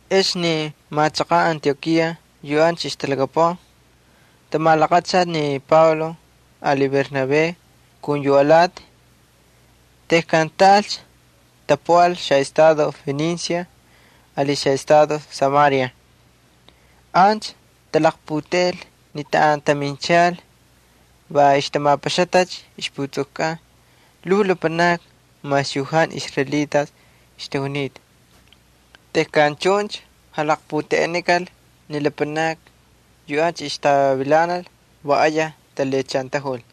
Ex ni machaqan Antiokía yu ancha ixtalhakapuꞌan tamalaqachalcha ni Pablo ali Bernabé kun yu alati. Tejkan taꞌalcha, tapuꞌal xaꞌestado Fenicia ali xaꞌestado Samaria. Ancha talaqputeꞌel ni taꞌan taminchal va ixtamapaxatacha ixputsukukꞌan lhuu lapanakni mas yu jantu israelitas ixtajunita. Tejkan chuncha jalaqputeꞌenikal ni lapanakni yu ancha ixtavilanal va ayaj talhiꞌachantajul.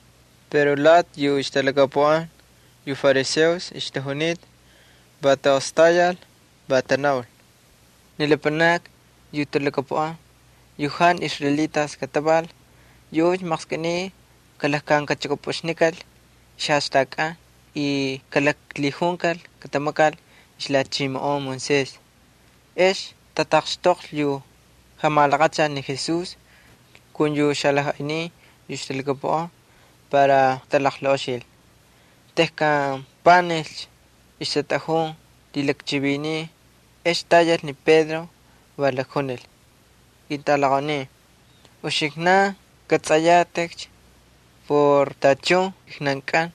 Pero lati yu ixtalhakapuꞌan yu fariseos ixtajunita, va taꞌostayal, va tanaul: —Ni lapanakni yu talhakapuꞌan yu jantu israelitas kataval, yuꞌuncha maqskꞌiniy kalakxvililichukꞌupꞌuxnikal y kalaklhijunkal katamakal ixlhachimoꞌon Moisés. Ex tataqxtoqlhi yu jamalaqachal ni Jesús kun yu xalajꞌaynin yu ixtalhakapuꞌan para katalaqlaꞌoxil. Tejkan panijcha ixtatꞌajun lhilakchivinin, ex tayal ni Pedro, va lakjunil: —Ketꞌalaqaunin, uxiknan kꞌatsꞌayatꞌikcha por tachun kijnankꞌan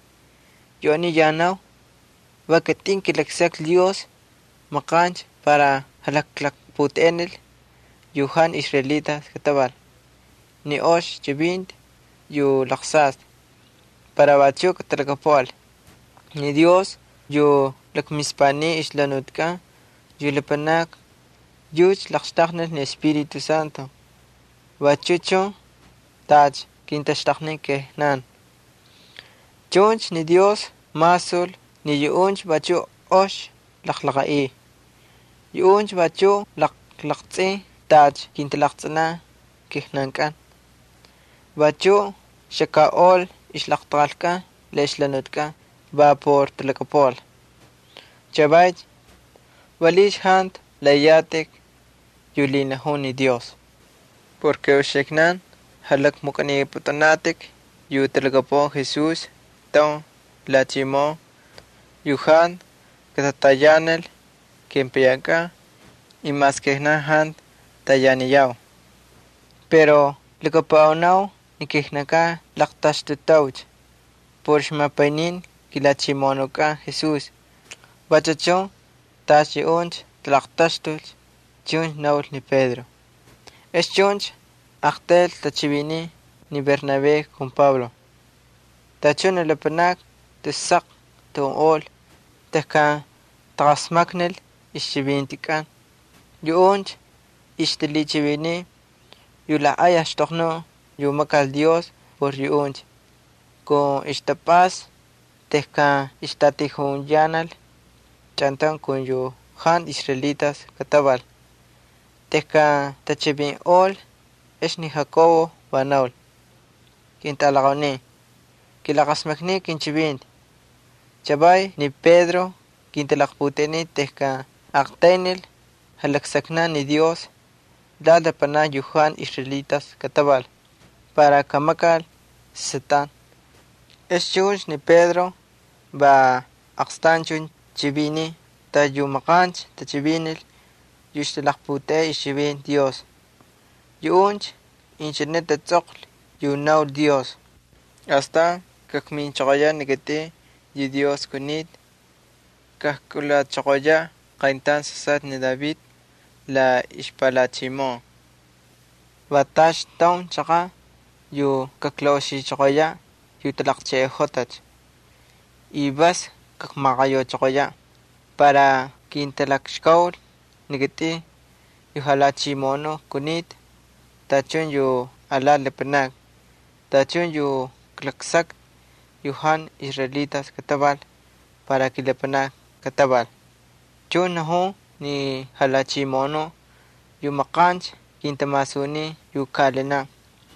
yu aniy yanau, va kitꞌin kilaksaklhi Dios maqancha para kajkalaqputeꞌenil yu jantu israelitas kataval ni ox chivinti para vachuꞌ katalhakapuꞌal. Ni Dios yu lakmispaniy ixjalhanutikꞌan ni lapanakni yucha laqxtaqnil ni Espíritu Santo vachu chun tacha kintaxtaqnin kijnan. Chuncha ni Dios masul ni yuꞌuncha vachuꞌ ox jalaqaꞌiy. Yuꞌuncha vachuꞌ jalaqtsꞌin tacha kintalaqtsꞌinan kijnankꞌan. Vachuꞌ xakaꞌol ixlaqtaqalkꞌan la ixjalhanutikꞌan va por talhakapuꞌal. Chavaycha, ¿valiꞌiycha jantu laꞌaꞌiyatꞌik yu lhinajun ni Dios? Uxiknan jalakmukꞌanipꞌutꞌunatꞌik yu talhakapuꞌan Jesús taun lhachimoꞌon yu jantu katatayanil kepayankꞌan y mas kijnan jantu tayaniyau. Pero lhakapuꞌanau ni kijnan laqtaxtutaucha por ixjamapayninti kiJalhachimoꞌonukꞌan Jesús, vachu chun tacha yuꞌuncha talaqtaxtul —chuncha naul ni Pedro. Ex chuncha taꞌaqtayl tachiviniy ni Bernabé ali Pablo. Tachun ni lapanakni tus saq tajunꞌol tejkan taqasmaknil ixchivintikꞌan. Yuꞌuncha ixtalhichiviniy yu lajꞌay axtoqnuꞌ yu makal Dios por yuꞌuncha kun ixtapꞌasta tejkan ixtatijuyanal chꞌantaun kun yu jantu israelitas kataval. Tejkan tachivinꞌol, ex ni Jacobo va naul: —Ketꞌalaqaunin, kilaqasmakniu kinchivinti. Chavay ni Pedro kintalaqputeꞌenin tejkan aqtaynil jalaksaknaꞌ ni Dios lati lapanakni yu jantu israelitas ixtajunita, para kamakal sasꞌatꞌan. Ex chuncha ni Pedro va aqstanchun chiviniy tacha yu maqancha tachivinil yu ixtalaqputeꞌey ixchivinti Dios. Yuꞌuncha inchine tatsꞌoqlhi yu naul Dios: Astan kakminchoqoyaꞌ ni kitꞌin yu Dios kunita, kajkꞌulachoqoya qayntaun sasꞌatꞌa ni David la ixpalhachimoꞌon. Va tacha taun chaqaꞌ yu kaklaꞌoxichoqoyaꞌ yu talaqcheꞌeꞌojotacha, vas kakmaqayauchoqoyaꞌ, para kintalakxkaul ni kitꞌin yu Jalhachimoꞌonuꞌ kunita tachun yu alati lapanakni, tachun yu klaklaksakta yu jantu israelitas ixtajunita para kilapanakni kataval. Chuncha najun ni Jalhachimoꞌonuꞌ yu maqancha kintamasunin yu kaꞌalinaꞌ.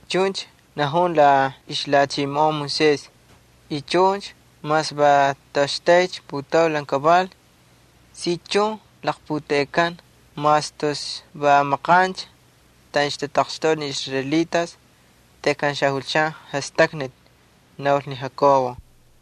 Chuncha najun la ixlhachimoꞌon Moisés y chuncha mas va toꞌoxtaycha putaulan kaval si chun laqputeꞌekan mas tus va maqancha taꞌan tataqxtoꞌa ni israelitas tejkan xajulchan jastaknati —naul ni Jacobo.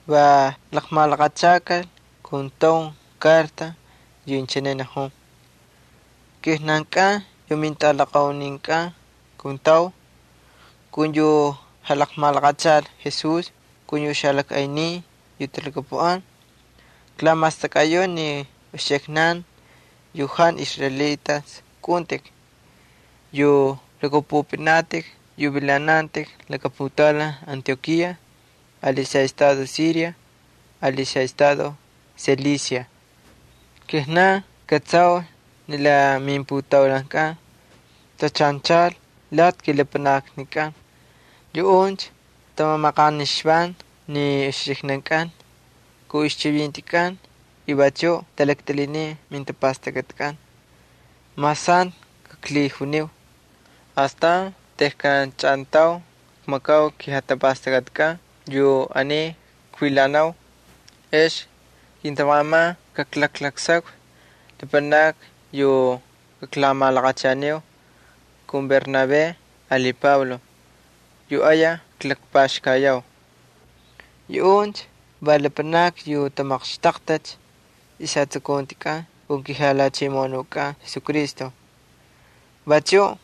Va laqmalaqachal kun taun karta yu inchine najun: “Kijnankꞌan yu mintꞌalaqauninkꞌan kuntau kun yu jalaqmalaqachal Jesús kun yu xapaynincha yu talhachimoꞌonun lakatajtan. Klamastakꞌayau ni uxiknan yu jantu israelitas kꞌaꞌuntꞌik yu lhakꞌapꞌupꞌinatꞌik yu vilanantꞌik laka putaulan Antiokía ali xaꞌestado Siria ali xaꞌestado Cilicia. Kijnan kꞌatsau ni la mimputaulankꞌan tachanchal lati kilapanaknikꞌan. Yuꞌuncha tamamaqanixvan ni uxiknankꞌan kun ixchivintikꞌan y vachuꞌ talaktꞌilhinin mijatapastakꞌatikꞌan, mas jantu klaklhijuniu. Astan tejkan chꞌantaun kmakau kijatapastakꞌatikꞌan yu aniy kvilanau, ex kintamaqaman kaklaklaksakvi lapanakni yu kaklamalaqachaniu kun Bernabé ali Pablo yu ayaj klakpaxkayau. Yuꞌuncha va lapanakni yu tamaqxtaqtacha ixjatsukuntikꞌan kun kiJalhachimoꞌonukꞌan Jesucristo. Vachuꞌ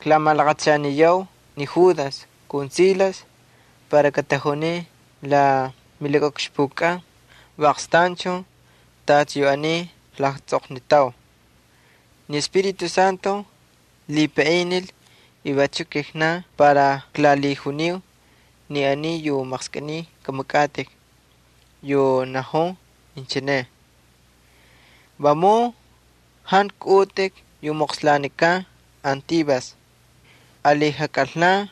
klamalaqachaniyau ni Judas ali Silas para katajunin la milakaꞌukxpukꞌan va aqstanchun tacha yu aniy klatsꞌoqnitau. Lhipaꞌinil ni Espíritu Santo y vachuꞌ kijnan para kaklalhijuniu ni aniy yu maqskꞌiniy kꞌamakꞌatꞌik, yu najun inchine: Vamun jantu kꞌaꞌutꞌik yu moqslanikan antivas ali jakꞌalna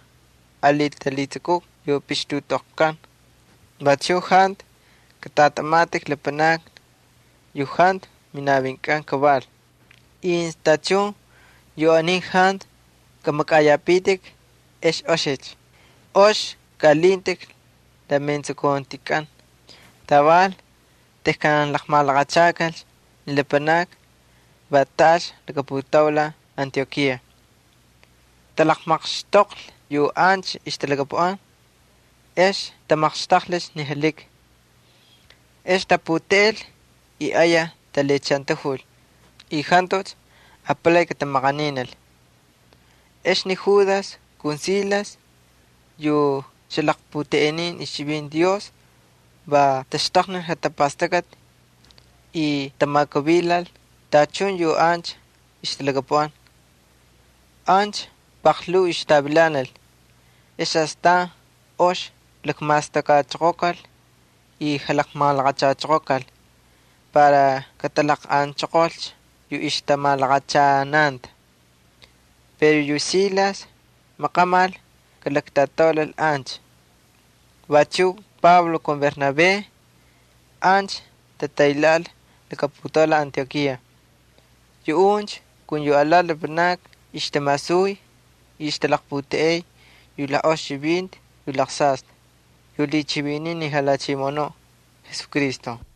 ali talhitsukuti yu pixtutꞌoqlkan. Vachuꞌ jantu katꞌatꞌamatꞌik lapanaki yu jantu minavinkꞌan kaval. Incha tachun yu aniy jantu kamakꞌayapitik, ex oxicha. Ox kaꞌalintꞌik la metsukuntikꞌan.” Taval tejkan laqmalaqachakalcha ni lapanakni va taꞌalcha laka putaulan Antiokía. Talaqmaqxtoqlhi yu ancha ixtalhakapuꞌan, ex tamaqxtaqlhicha ni jalhiki. Ex taputeꞌel y ayaj talhiꞌachantajul y jantucha apalay katamaqaninil. Ex ni Judas ali Silas yu xalaqputeꞌenin ixchivinti Dios va taxtaqnil jatapastakꞌati y tamakuvilal tachun yu ancha ixtalhakapuꞌan. Ancha paqlhuu ixtavilanal ex astan ox lakmastakꞌachoqokal y malaqachachoqokal para katalaqꞌanchoqolcha yu ixtamalaqachananta. [ Pero yu Silas maqamal kalaktꞌataulal ancha.] Vachuꞌ Pablo ali Bernabé ancha tataylhaꞌal laka putaulan Antiokía. Yuꞌuncha kun alati lapanakni ixtamasuy y ixtalaqputeꞌey yu ox chivinti yu lhichiviniy ni Jalhachimoꞌonuꞌ Jesucristo.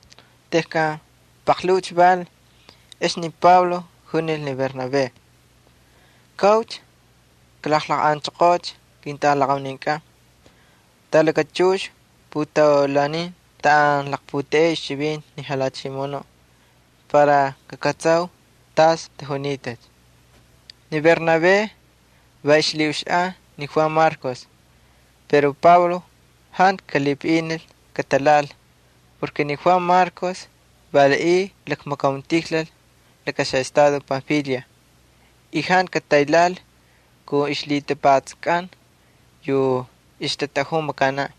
Tejkan paqlhuucha val, ex ni Pablo junil ni Bernabé: —Kaꞌaucha, kalaqꞌanchoqoocha ketꞌalaqauninkꞌan talakachux putaulanin taꞌan laqputeꞌeu ixchivinti ni Jalhachimoꞌonuꞌ, para kakꞌatsau tas tajunitacha. Ni Bernabé va ixlhiꞌuxaꞌan ni Juan Marcos. Pero Pablo jantu kalhipaꞌinil katalhaꞌal porke ni Juan Marcos valiꞌiy lakmakauntijlal laka estado Panfilia y jantu kataylhaꞌal kun ixlhitapatsakꞌan yu ixtatꞌajun makanaꞌ.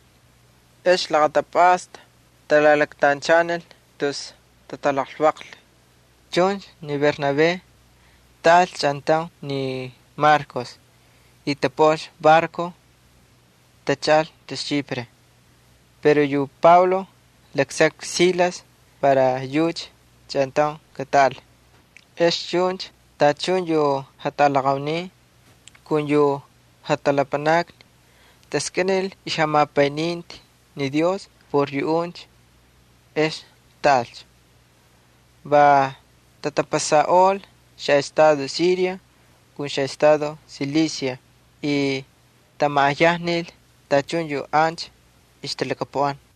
Ex laqatapꞌasta talalaktanchanil tus tatalaqlvaqlhi. Chuncha ni Bernabé tꞌaꞌalcha chꞌantaun ni Marcos y tapuꞌal barco, tachaꞌal tus Chipre. Pero yu Pablo laksaklhi ni Silas para yucha chꞌantaun katꞌaꞌal, ex chuncha tachun yu jatꞌalaqaunin ali yu jatꞌalapanakni taskꞌinil ixjamapayninti ni Dios por yuꞌuncha, ex taꞌalcha. Va tatapasaꞌol xaꞌestado Siria ali xaꞌestado Cilicia y tamaꞌayajnil tachun yu ancha ixtalhakapuꞌan.